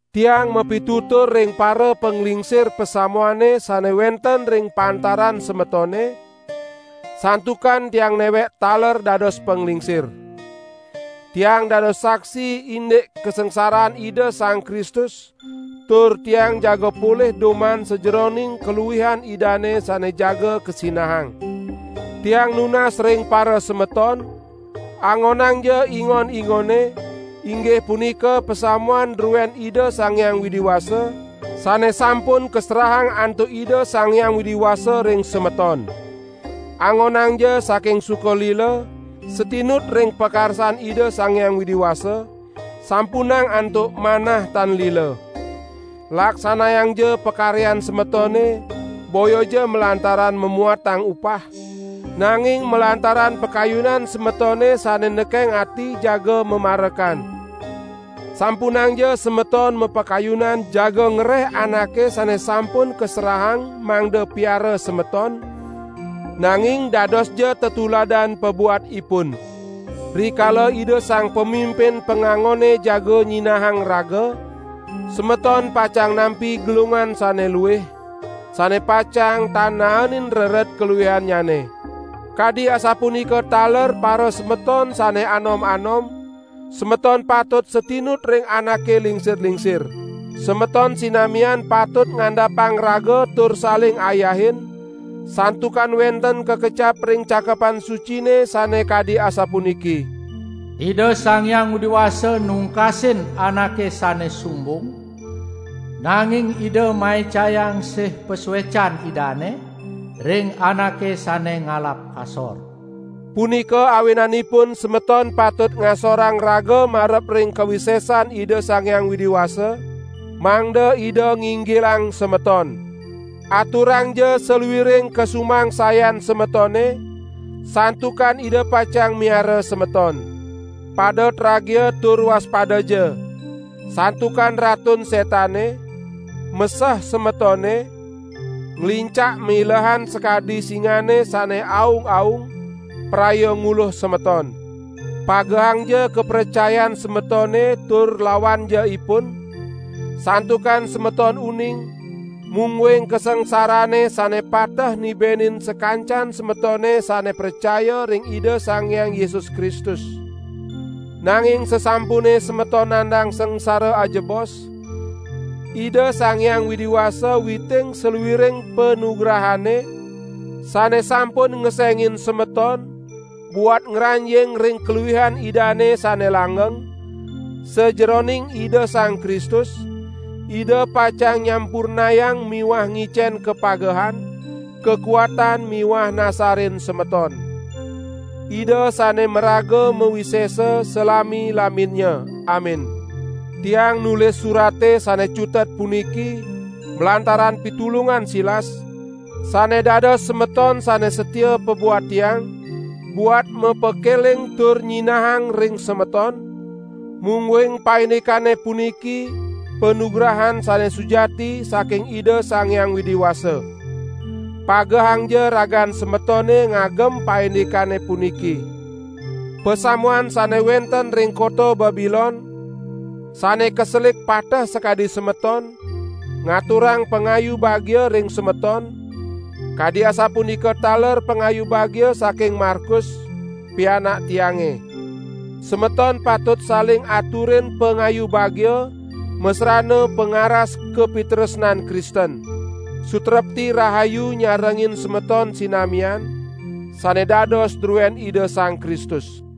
Tiang mapitutur ring parapanglingsir pasamuane sane wenten ring pantaran semetone, santukan tiang newek taler dados panglingsir. Tiang dados saksi indik kasangsaran Ida Sang Kristus tur tiang jaga polih duman sajeroning kaluihan Idane sane jaga kasinahang. Tiang nunas ring parasemeton: Angonangja ingon-ingone, inggih punika pasamuan druen Ida Sang Hyang Widi Wasa, sane sampun kaserahang antuk Ida Sang Hyang Widi Wasa ring semeton. Angonangja saking suka lila, satinut ring pakarsan Ida Sang Hyang Widi Wasa, sampunang antuk manah tan lila. Laksanayangja pakaryan semetone boyaja malantaran mamuatang upah, nanging malantaran pakayunan semetone sane nekeng ati jaga mamarekan. Sampunangja semeton mapakayunan jaga ngereh anake sane sampun kaserahang mangda piara semeton, nanging dadosja tetuladan pabuat ipun. Rikala Ida Sang Pamimpin pangangone jaga nyinahang raga, semeton pacang nampi gelungan sane luih, sane pacang tan naenin rered kaluihannyane. Kadi asapunika taler parasemeton sane anom-anom, semeton patut satinut ring anake lingsir-lingsir. Semeton sinamian patut ngandapang raga tur saling ayahin, santukan wenten kakecap ring Cakepan Sucine sane kadi asapuniki: "Ida Sang Hyang Widi Wasa nungkasin anake sane sumbung, nanging Ida maicayang sih pasuecan Idane ring anake sane ngalap kasor." Punika awinanipun semeton patut ngasorang raga marep ring kawisesan Ida Sang Hyang Widi Wasa, mangda Ida nginggilang semeton. Aturangja saluiring kasumangsayan semetone, santukan Ida pacang miara semeton. Pada tragia tur waspadaja! Santukan Ratun Setane, meseh semetone, nglincak milehan sakadi singane sane aung-aung, praya nguluh semeton. Pagehangja kapracayan semetone tur lawanja ipun, santukan semeton uning, mungguing kasangsarane sane pateh nibenin sakancan semetone sane pracaya ring Ida Sang Hyang Yesus Kristus. Nanging sasampune semeton nandang sangsara ajebos, Ida Sang Hyang Widi Wasa witing saluiring panugrahane, sane sampun ngesengin semeton buat ngranjing ring kaluihan Idane sane langgeng, sajeroning Ida Sang Kristus, Ida pacang nyampurnayang miwah ngicen kapagehan, kakuatan miwah nasarin semeton. Ida sane maraga mawisesa salami-laminnya. Amin. Tiang nulis surate sane cutet puniki malantaran pitulungan Silas, sane dados semeton sane satia pabuat tiang, buat mapakeling tur nyinahang ring semeton, mungguing paindikane puniki panugrahan sane sujati saking Ida Sang Hyang Widi Wasa. Pagehangja ragan semetone ngagem paindikane puniki. Pasamuan sane wenten ring kota Babilon, sane kaselik pateh sakadi semeton, ngaturang pangayu bagia ring semeton, kadi asapunika taler pangayu bagia saking Markus, pianak tiange. Semeton patut saling aturin pangayu bagia masrana pangaras kapitresnan Kristen. Sutrepti rahayu nyarengin semeton sinamian, sane dados druen Ida Sang Kristus.